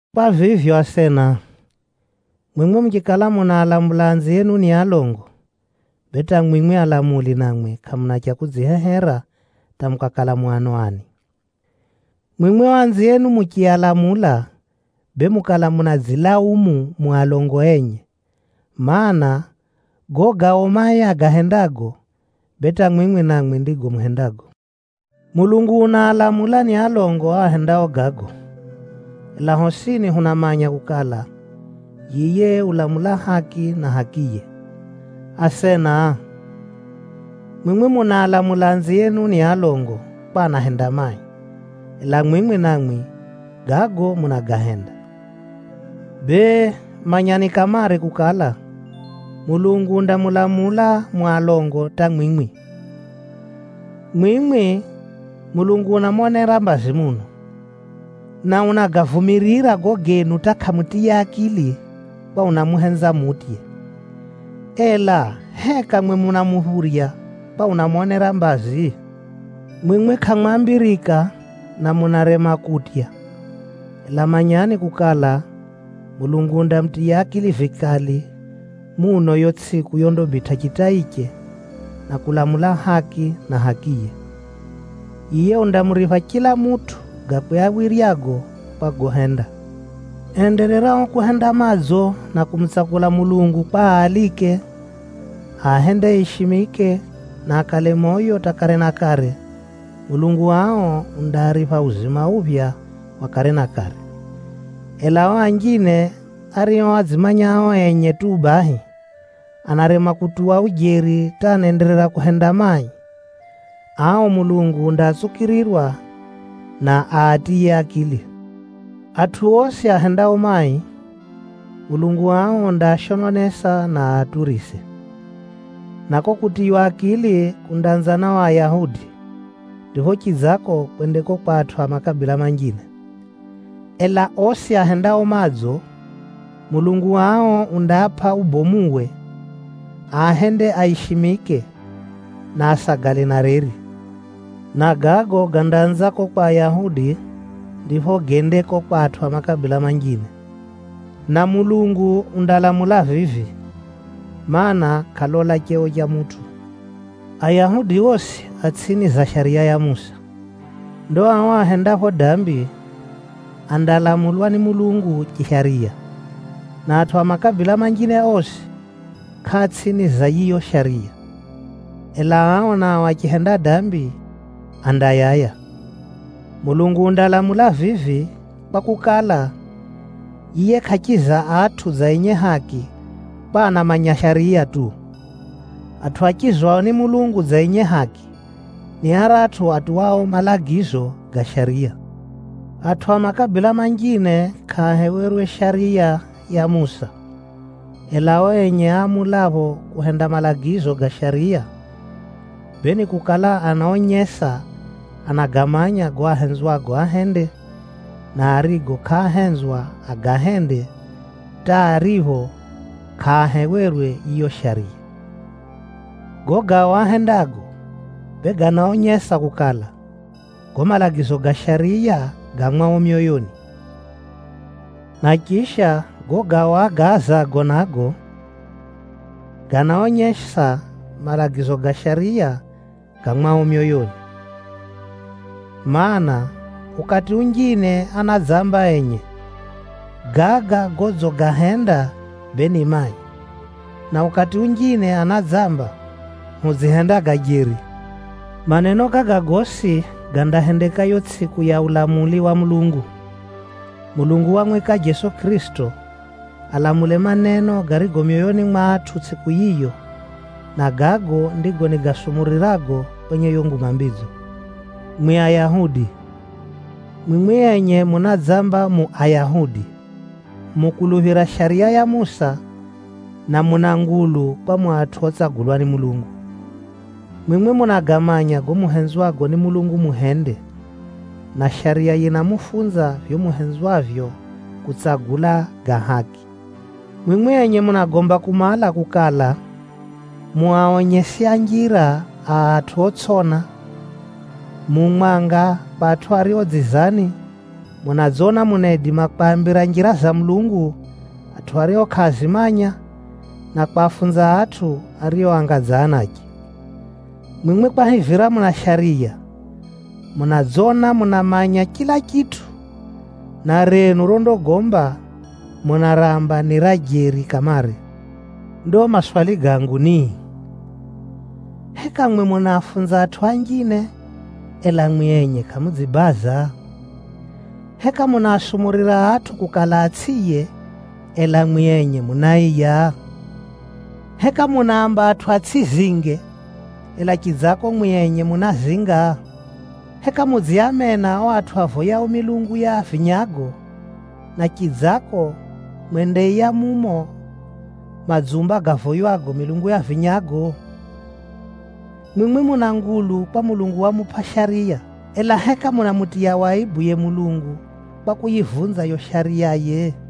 Kwa vivyo asena, mwimwi muchikala munaalamula anzienu ni alongo, bee hata mwimwi alamuli namwi, kʼamuna cha kudzihehera hata mukakala mu ano ani. Mwimwi o anzienu muchialamula, bee mukala munadzilaumu mu alongo enye. Maana, gago gao mai agahendago, bee hata mwimwi namwi ndigo muhendago. Mulungu unaalamula ni alongo o ahendao gago, ela hosini hunamanya kukala, yiye ulamula haki na hakiye. Asena, mwimwi munaalamula anzienu ni alongo kwa anahenda mai, ela mwimwi namwi, gago munagahenda. Bee, manyani kamare kukala, Mulungu undamulamula mu alongo hata mwimwi. Mwimwi, Mulungu unamonera mbazi muno, na unagavumirira gago genu hata kʼamutiya akili kwa unamuhenza mutye. Ela heka mwi munamuphurya kwa unamonera mbazi? Mwimwi kʼamwambirika na munarema kutya, ela manyani kukala, Mulungu undamutiya akili vikali muno yo tsʼiku yondabitʼa chitaiche, na kulamula haki na hakiye. Yiye undamuripha chila mutʼu gakwe awiryago kwa gohenda. Endererao kuhenda madzo na kumutsakula Mulungu kwa aalike, aahende aishimike, na akale moyo hata kare na kare, Mulungu ao undaaripha uzima uphya wa kare na kare. Ela o anjine ario adzimanya ao enye tu bahi, anarema kutuwa ujeri hata anaenderera kuhenda mai, ao Mulungu undaatsukirirwa, na aatiye akili. Atʼu osi ahendao mai, Mulungu ao undaashononesa, na aaturise. Na ko kutiywa akili kundaanza na o Ayahudi, ndipho chidzako kwende ko kwa atʼu a makabila manjine. Ela osi ahendao madzo, Mulungu ao undaapʼa ubomuwe, aahende aishimike, na asagale na reri. Na gago gandaanza ko kwa Ayahudi, ndipho gende ko kwa atʼu a makabila manjine. Na Mulungu undalamula vivi, mana, kʼalola cheo cha mutʼu. Ayahudi osi a tsʼini za Shariya ya Musa. Ndo ao ahendapho dambi, andalamulwa ni Mulungu chishariya. Na atʼu a makabila manjine osi, kʼaa tsʼini za yiyo Shariya. Ela ao nao achihenda dambi, andayaya. Mulungu undalamula vivi, kwakukala, yiye kʼachiza atʼu dza enye haki kwa anamanya Shariya tu. Atʼu achizwao ni Mulungu dza enye haki, ni aratʼu atuwao malagizo ga Shariya. Atʼu a makabila manjine kʼaahewerwe Shariya ya Musa. Ela o enye aamulapho kuhenda malagizo ga Shariya, bee nikukala anaonyesa anagamanya gago ahenzwago ahende, na arigo kʼaahenzwa agahende, hata aripho kʼaahewerwe yiyo Shariya. Gago gao ahendago, bee ganaonyesa kukala, gago malagizo ga Shariya ga mwao myoyoni. Na chisha, gago gao agaazago nago, ganaonyesa malagizo ga Shariya ga mwao myoyoni. Maana, ukati unjine anadzamba enye, “Gaga godzigahenda, bee ni mai,” na ukati unjine anadzamba, “Hudzihenda ga jeri.” Maneno gaga gosi gandahendeka yo tsʼiku ya ulamuli wa Mulungu. Mulungu wamwika Jeso Kʼirisito alamule maneno garigo myoyoni mwa atʼu tsʼiku yiyo, na gago ndigo nigasumurirago kwenye yo Nguma Mbidzo. Mwi Ayahudi, mwimwi enye munadzamba mu Ayahudi, mukuluphira Shariya ya Musa, na muna ngulu kwa mu atʼu otsagulwa ni Mulungu. Mwimwi munagamanya gago muhenzwago ni Mulungu muhende, na Shariya yinamufunza vivyo muhenzwavyo kutsagula ga haki. Mwimwi enye munagomba kumala kukala, mu aonyesi a njira a atʼu otsʼiona, mu mwanga kwa atʼu ario dzizani, munadzona munaidima kwambira njira za Mulungu atʼu ario kʼaazimanya, na kwafunza atʼu ario anga dza anache. Mwimwi kwahivira muna Shariya, munadzona munamanya chila chitʼu, na renu rondagomba, munaramba ni ra jeri kamare. Ndo maswali gangu ni: heka mwi munaafunza atʼu anjine, ela mwi enye kʼamudzibaza? Heka munaasumurira atʼu kukala atsʼiiye, ela mwi enye munaiya? Heka munaamba atʼu atsʼizinge, ela chidzako mwi enye munazinga? Heka mudziamena o atʼu avoyao milungu ya vinyago, na chidzako mwendaiya mumo madzumba gavoywago milungu ya vinyago? Mwimwi muna ngulu kwa Mulungu wamupʼa Shariya, ela heka munamutiya waibu yiye Mulungu, kwa kuyivunza yo Shariyaye?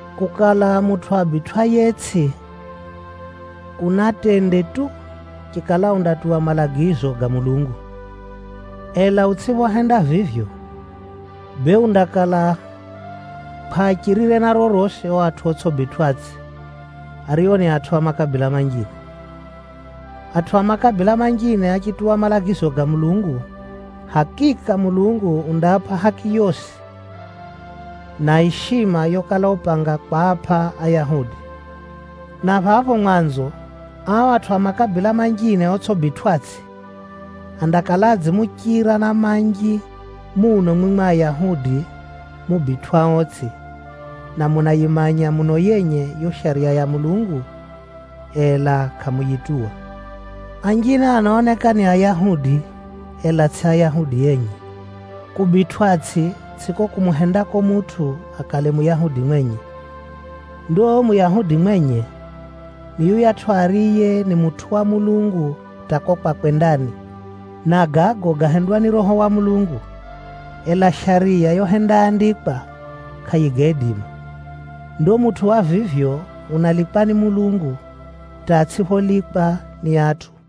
Kukala mutʼu abitwʼayetsʼi, kuna tende tu, chikala undatuwa malagizo ga Mulungu. Ela utsʼiphohenda vivyo, bee undakala kʼwachirire na rorosi o atʼu otsʼibitwʼatsʼi, ario ni atʼu a makabila manjine. Atʼu a makabila manjine achituwa malagizo ga Mulungu, hakika Mulungu undaapʼa haki yosi, na ishima yokala upanga kwapʼa Ayahudi! Na phapho mwanzo, ao atʼu a makabila manjine otsʼibitwʼatsʼi, andakala adzimuchira na manji muno mwimwi Ayahudi mubitwʼaotsʼi, na munayimanya muno yenye yo Shariya ya Mulungu, ela kʼamuyituwa. Anjine anaoneka ni Ayahudi, ela tsʼi Ayahudi enye. Kubitwʼatsʼi tsʼiko kumuhendako mutʼu akale Muyahudi mwenye. Ndo Muyahudi mwenye, ni yuyatʼu ariye ni mutʼu wa Mulungu hata ko kwakwe ndani. Na gago gahendwa ni Roho wa Mulungu, ela Shariya yohendaandikwa, kʼayigaidima. Ndo mutʼu wa vivyo unalikwa ni Mulungu, hata atsʼipholikwa ni atʼu.